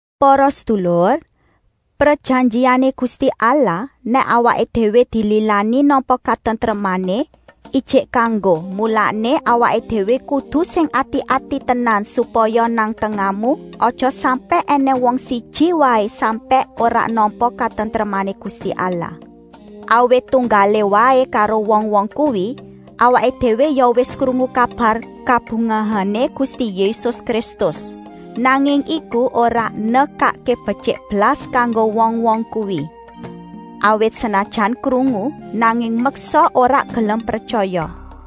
Para sedulur, prejanjiané Gusti Allah nèk awaké déwé dililani nampa katentremané, ijik kanggo, mulané awaké déwé kudu sing ati-ati tenan supaya nang tengahmu aja sampèk ènèng wong siji waé sampèk ora nampa katentremané Gusti Allah. Awit tunggalé waé karo wong-wong kuwi, awaké déwé ya wis krungu kabar kabungahané Gusti Yésus Kristus. Nanging iku ora nekakké betyik blas kanggo wong-wong kuwi. Awit senajan krungu, nanging meksa ora gelem pretyaya.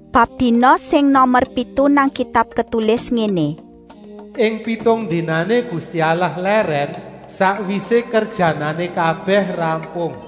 Bab dina sing nomer pitu nang Kitab ketulis ngéné: “Ing pitung dinané Gusti Allah lèrèn sakwisé kerjanané kabèh rampung.”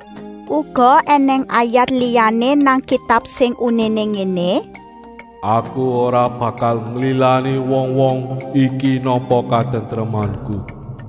Uga ènèng ayat liyané nang Kitab sing uniné ngéné: “Aku ora bakal nglilani wong-wong iki nampa katentremanku.”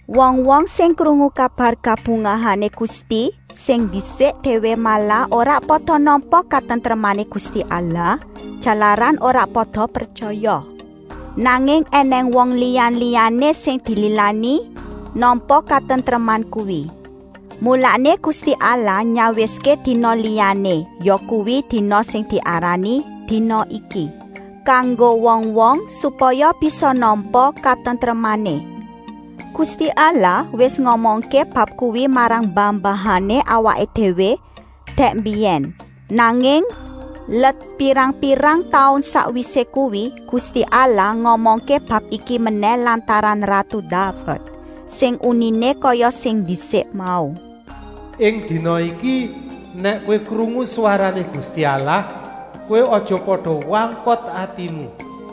Wong-wong sing krungu kabar kabungahané Gusti sing ndisik déwé malah ora pada nampa katentremané Gusti Allah, jalaran ora pada pretyaya. Nanging ènèng wong liya-liyané sing dililani nampa katentreman kuwi. Mulané Gusti Allah nyawiské dina liyané, yakuwi dina sing diarani “dina iki,” kanggo wong-wong, supaya bisa nampa katentremané. Gusti Allah wis ngomongké bab kuwi marang mbah-mbahané awaké déwé dèk mbiyèn, nanging let pirang-pirang taun sakwisé kuwi, Gusti Allah ngomongké bab iki menèh lantaran ratu Daved, sing uniné kaya sing ndisik mau: “Ing dina iki, nèk kowé krungu swarané Gusti Allah, kowé aja pada wangkot atimu.”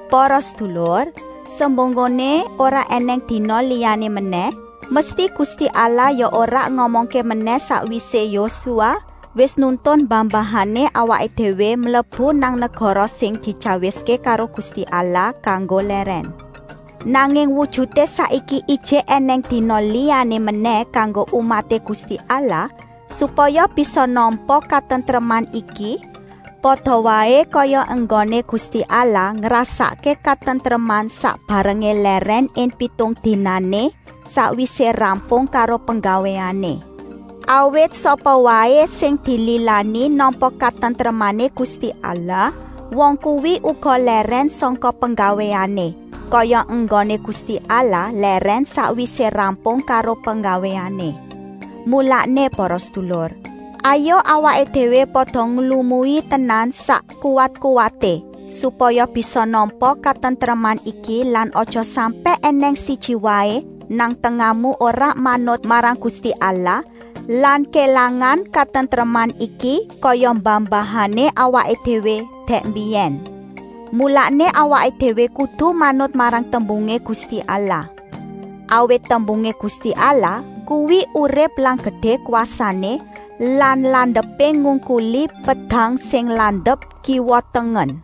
Para sedulur, semunggoné ora ènèng dina liyané menèh, mesti Gusti Allah ya ora ngomongké menèh sakwisé Yosua wis nuntun mbah-mbahané awaké déwé mlebu nang negara sing dityawiské karo Gusti Allah kanggo lèrèn. Nanging wujuté saiki ijik ènèng dina liyané menèh kanggo umaté Gusti Allah supaya bisa nampa katentreman iki, pada waé kaya enggoné Gusti Allah ngrasakké katentreman sak barengé lèrèn ing pitung dinané, sakwisé rampung karo penggawéané. Awit sapa waé sing dililani nampa katentremané Gusti Allah, wong kuwi uga lèrèn sangka penggawéané, kaya enggoné Gusti Allah lèrèn sakwisé rampung karo penggawéané. Mulané para sedulur, hayuk awaké déwé pada nglumui tenan sak kuwat-kuwaté, supaya bisa nampa katentreman iki lan aja sampèk ènèng siji waé nang tengahmu ora manut marang Gusti Allah lan kélangan katentreman iki, kaya mbah-mbahané awaké déwé dèk mbiyèn. Mulané awaké déwé kudu manut marang tembungé Gusti Allah. Awit tembungé Gusti Allah kuwi urip lan gedé kwasané lan landepé ngungkuli pedang sing landep kiwa-tengen.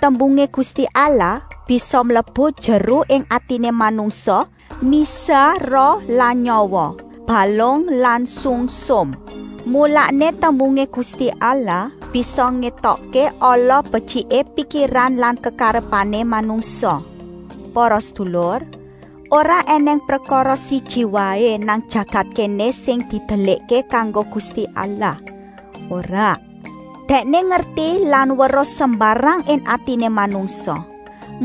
Tembungé Gusti Allah bisa mlebu jeru ing atiné manungsa, misah roh lan nyawa, balung lan sungsum. Mulané tembungé Gusti Allah bisa ngétokké ala-betyiké pikiran lan kekarepané manungsa. Para sedulur, ora ènèng prekara siji waé nang jagat kéné sing didelikké kanggo Gusti Allah, ora. Dèkné ngerti lan weruh sembarang ing atiné manungsa.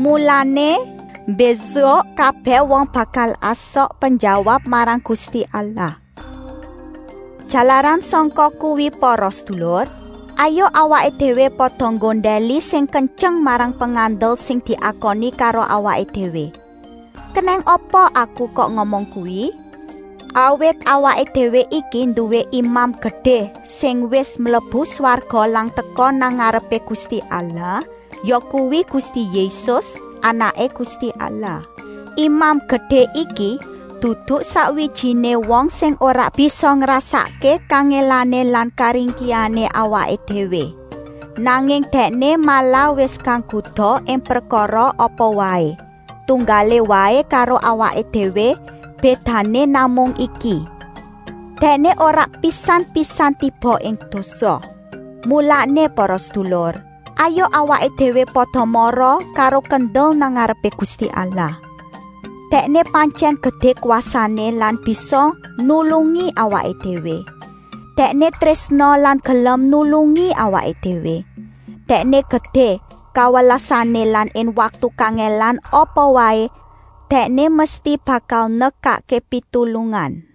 Mulané, mbésuk kabèh wong bakal asok penjawab marang Gusti Allah. Jalaran sangka kuwi para sedulur, hayuk awaké déwé pada nggondèli sing kentyeng marang pengandel sing diakoni karo awaké déwé. Kenèng apa aku kok ngomong kuwi? Awit awaké déwé iki nduwé Imam Gedé sing wis mlebu swarga lan teka nang ngarepé Gusti Allah, yakuwi Gusti Yésus, Anaké Gusti Allah. Imam Gedé iki dudu sakwijiné wong sing ora bisa ngrasakké kangèlané lan karingkihané awaké déwé, nanging Dèkné malah wis kagoda ing prekara apa waé, tunggalé waé karo awaké déwé. Bédané namung iki: Dèkné ora pisan-pisan tiba ing dosa. Mulané para sedulur, hayuk awaké déwé pada mara karo kendel nang ngarepé Gusti Allah. Dèkné pantyèn gedé kwasané lan bisa nulungi awaké déwé. Dèkné trésna lan gelem nulungi awaké déwé. Dèkné gedé kawelasané lan ing waktu kangèlan apa waé, Dèkné mesti bakal nekakké pitulungan.